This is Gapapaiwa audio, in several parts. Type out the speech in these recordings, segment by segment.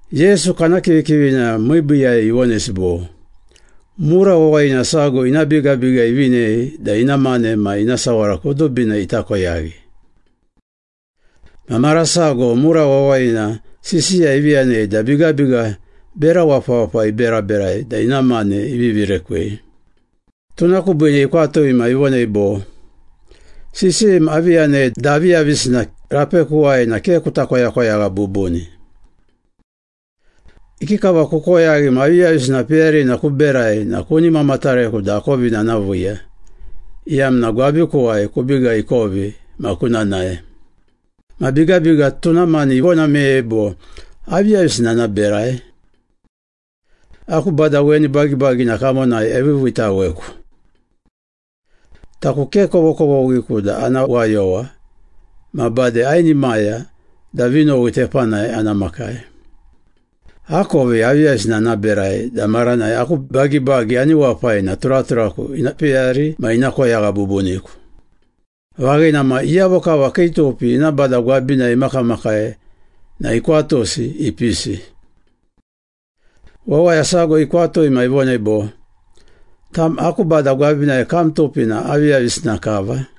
Yesu kana kivikivina miibiiyai ivonesi bo, “Mura wawayina sago ina bigabiga ivinei da ina mane ma ina sawara kudubina ita koyaghi. Ma mara sago mura wawayina sisiya ivi yanei da bigabiga bera wapawapa iberaberai da ina mane ivivi rekwei. Tuna kubiine ikwatui ma ivonei bo, ‘Sisiyim avi yanei da aviyavisina rapekuwai na ke kuta koyakoyagha bubuni. Ikikava kukoyaghi ma aviyavisina peyarina kuberai na kuni mamatareku da akovina ana viiya, iyamna gwabikuwai kubiga ikovi ma kuna nae.’ Ma bigabiga tuna mani ivona meyei bo, ‘Aviyavisina ana berai? Aku bada weni bagibagina kamonai eviiviitaweku. Taku ke kovokovoghiku da ana wayowa, ma bade ainimaya da vinowi tepanai ana makai. Akovi aviyavisina ana berai da maranai aku bagibagi ani wapai na turaturaku ina peyari ma ina koyagha bubuniku.’ Vaghina ma, iyavo kava kii tupi ina bada gwabinai imakamakai na ikwatusi ipisi. Wawaya sago ikwatui ma ivonei bo, ‘Tam aku bada gwabinai kam tupi na aviyavisina kava?’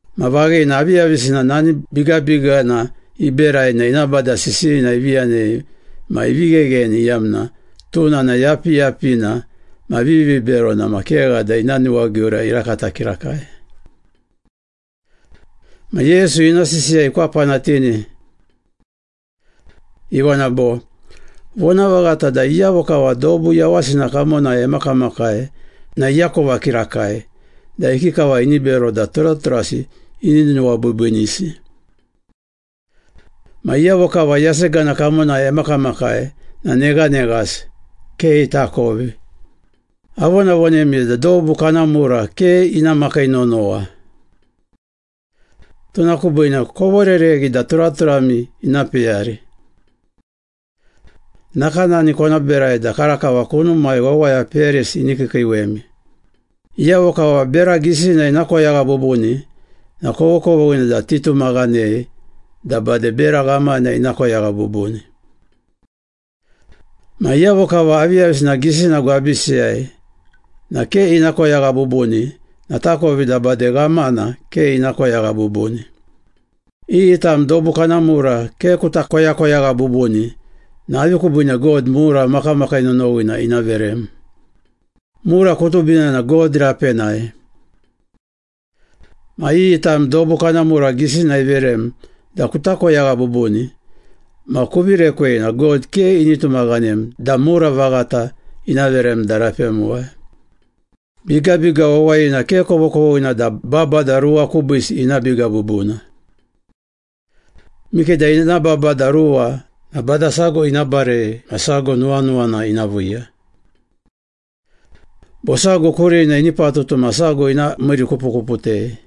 Ma vaghina, aviyavisina nani bigabigana iberai na ina bada sisiyina ivi yanei ma ivi ghegheni iyamna tuna na yapiyapina ma viviberona ma kegha da ina nuwagiura irakata kirakai.” Ma Yesu ina sisiya ikwapanatini. Ivona bo, “Vonavaghata da iyavo kava dobu yawasina kamonai emakamakai na iakova kirakai da ikikava ini bero da turaturasi ini nuwabiibiinisi. Ma iyavo kava yasegana kamonai emakamakai na neghaneghasi, ke itakovi.” “Avonavonemi da dobu kana mura ke ina makii nonowa. Tuna kubiine kovorereghi da turaturami ina peyari. Nakanani kona berai da karakava kunumai wawaya peyarisi ini kiikiiwemi. Iyavo kava bera gisina ina koyagha bubuni na kovokovoghina da titumaghanei da bade bera ghamana ina koyagha bubuni. Ma iyavo kava aviyavisina gisina gwabisiyai na ke ina koyagha bubuni na takovi da bade ghamana ke ina koyagha bubuni. Iyi tam dobu kana mura ke kuta koyakoyagha bubuni na avi kubiine God mura makamakii nonowina ina verem? Mura kudubina na God rapenai. Ma iyi tam dobu kana mura gisina iverem da kuta koyagha bubuni ma kuvi rekwei na God ke ini tumaghanem da mura vaghata ina verem da rapemuwai.” “Bigabiga wawayina ke kovokovoghina da babada ruwa kubiisi ina biga bubuna. Mikeda ina babada ruwa na bada sago ina barei ma sago nuwanuwana ina viiya. Bo sago kurina ini patutu ma sago ina miirikupukuputei.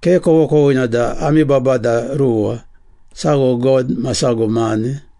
Ke kovokovoghina da ami babada ruwa, sago God ma sago mane.”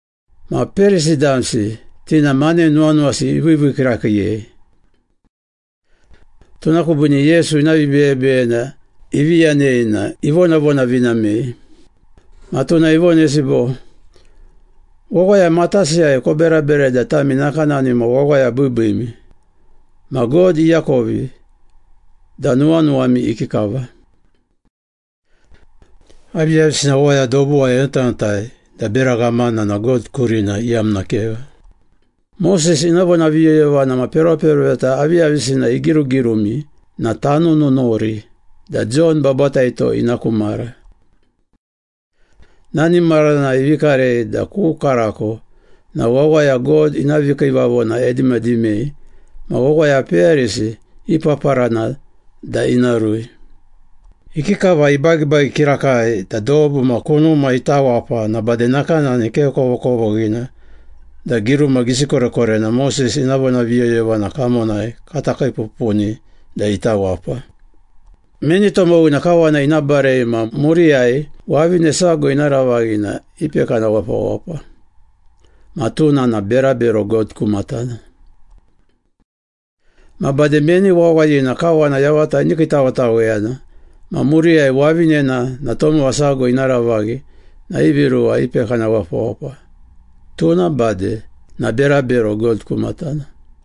Ma Perisi damsi, ti na mane nuwanuwasi iviivii kirakiiyei. Tuna kubiine Yesu ina vibeyebeyena ivi yanei na ivonavonavinamei. Ma tuna ivonesi bo, “Wawaya matasiyai koberaberai da tami nakanani ma wawaya biibiimi, ma God iakovi da nuwanuwami ikikava. Aviyavisina wawaya dobuwai enotanotai da bera ghamana na God kurina iyamna kegha.” “Moses ina vonaviyoyovana ma peroperoveta aviyavisina igirugirumi na tanununuri da Jon Babataito ina ku mara. Nani maranai ivi karei da ku karako na wawaya God ina vikiivavona edimadimei ma wawaya peyarisi ipaparana da ina rui. Ikikava ibagibagi kirakai da dobu ma kunuma ita wapa na bade nakanani ke kovokovoghina da giruma gisi korekorena Moses ina vonaviyoyovana kamonai kata kiipupuni da ita wapa.” “Meni tomowina kawana ina barei ma muriyai wavine sago ina ravaghi na ipekana wapawapa ma tuna na berabero God ku matana. Ma bade meni wawayina kawana yavata ini kiitawetaweyana ma muriyai wavinena na tomowa sago ina ravaghi na ivi ruwa ipekana wapawapa, tuna bade na berabero God ku matana.”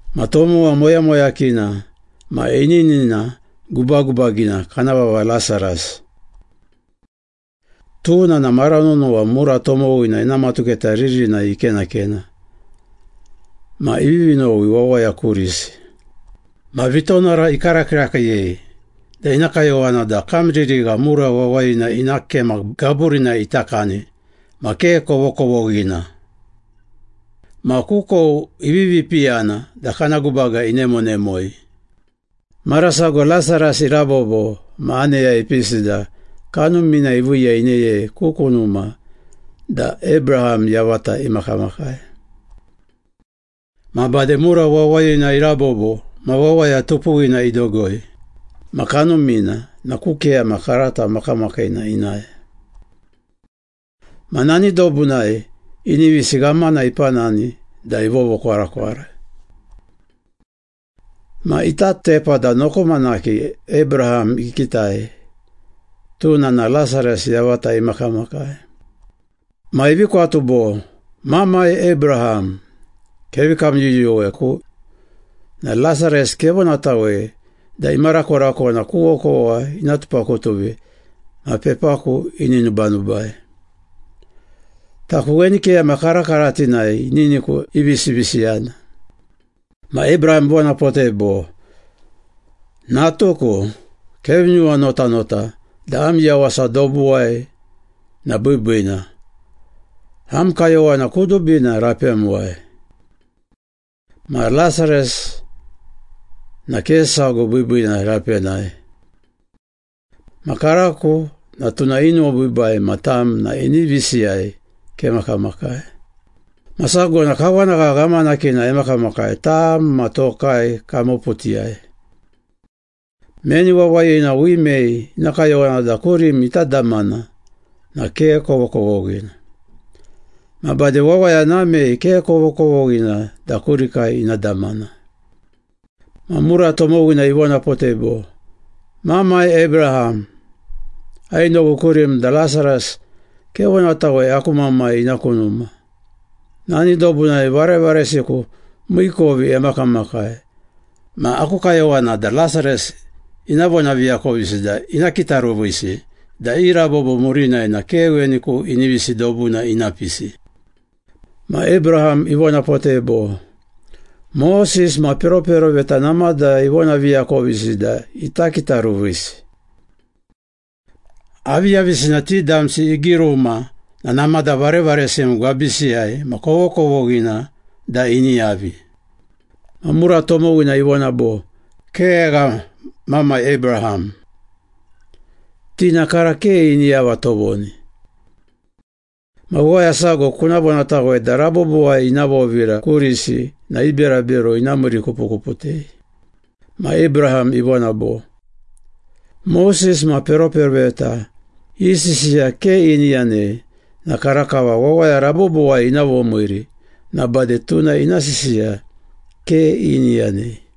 Ma tomowa moyamoyakina ma ininina gubagubagina kana vava Lasaras. Tuna na mara nonowa mura tomowina ina matuketa ririnai ikenakena ma ivivi nowi wawaya kurisi. Ma vitonara ikara kirakiiyei da ina kayowana da kamririgha mura wawayina ina kema gaburinai ita kani ma ke kovokovoghina. Ma kukou ivivi piyana da kana gubaga inemonemoi. Mara sago Lasaras irabobo ma aneya ipisi da kanumina iviiya ineyei ku kunuma da Abraham yavata imakamakai. Ma bade mura wawayina irabobo ma wawaya tupuwina idogoi, ma kanumina na ku keyama karata makamakiina inae. Ma nani dobunai inivisi ghamana ipanani da ivovokwarakwara. Ma ita tepa da nokomanaki Abraham ikitai, tuna na Lasaras yavata imakamakai. Ma ivi kwatu bo, ‘Mamai Abraham, kevi kamyuyuweku na Lasaras kevonatawei da imarakorakona ku okowa ina tupakutuvi ma pepaku ini nubanubai. Taku weni keyama karakaratinai ininiku ivisivisiyana.’ Ma Abraham ivonapotei bo, ‘Natuku, kevi nuwanotanota da am yawasa dobuwai na biibiina, am kayowana kudubina rapemuwai. Ma Lasaras na ke sago biibiina rapenai. Ma karako na tuna inuwabiibai ma tam na inivisiyai kemakamakai. Ma sago na kawanagha ghamanakina emakamakai tam ma tokai kamoputiyai. Meni wawayina wimei ina kayowana da kurim ita damana na ke kovokovoghina. Ma bade wawaya namei ke kovokovoghina da kurikai ina damana.’ Ma mura tomowina ivonapotei bo, ‘Mamai Abraham, ainowi kurim da Lasaras kevonatawei aku mamai ina ku numa. Nani dobunai varevaresiku miikovi emakamakai ma aku kayowana da Lasaras ina vonaviakovisi da ina kitaruvisi da i rabobo murinai na ke weni ku inivisi dobuna ina pisi.’ Ma Abraham ivonapotei bo, ‘Moses ma peroperoveta namada ivonaviakovisi da ita kitaruvisi. Aviyavisina ti damsi igiruma na namada varevaresim gwabisiyai ma kovokovoghina da ini yavi.’ Ma mura tomowina ivona bo, ‘Kegha, mamai Abraham, ti na kara ke ini yava tovoni. Ma wawaya sago kuna vonatawei da rabobowai ina vovira kurisi na i berabero ina miirikupukuputei.’ Ma Abraham ivona bo, ‘Moses ma peroperoveta i sisiya ke ini yanei na karakava wawaya rabobowai ina vomiiri na bade tuna ina sisiya ke ini yanei.’”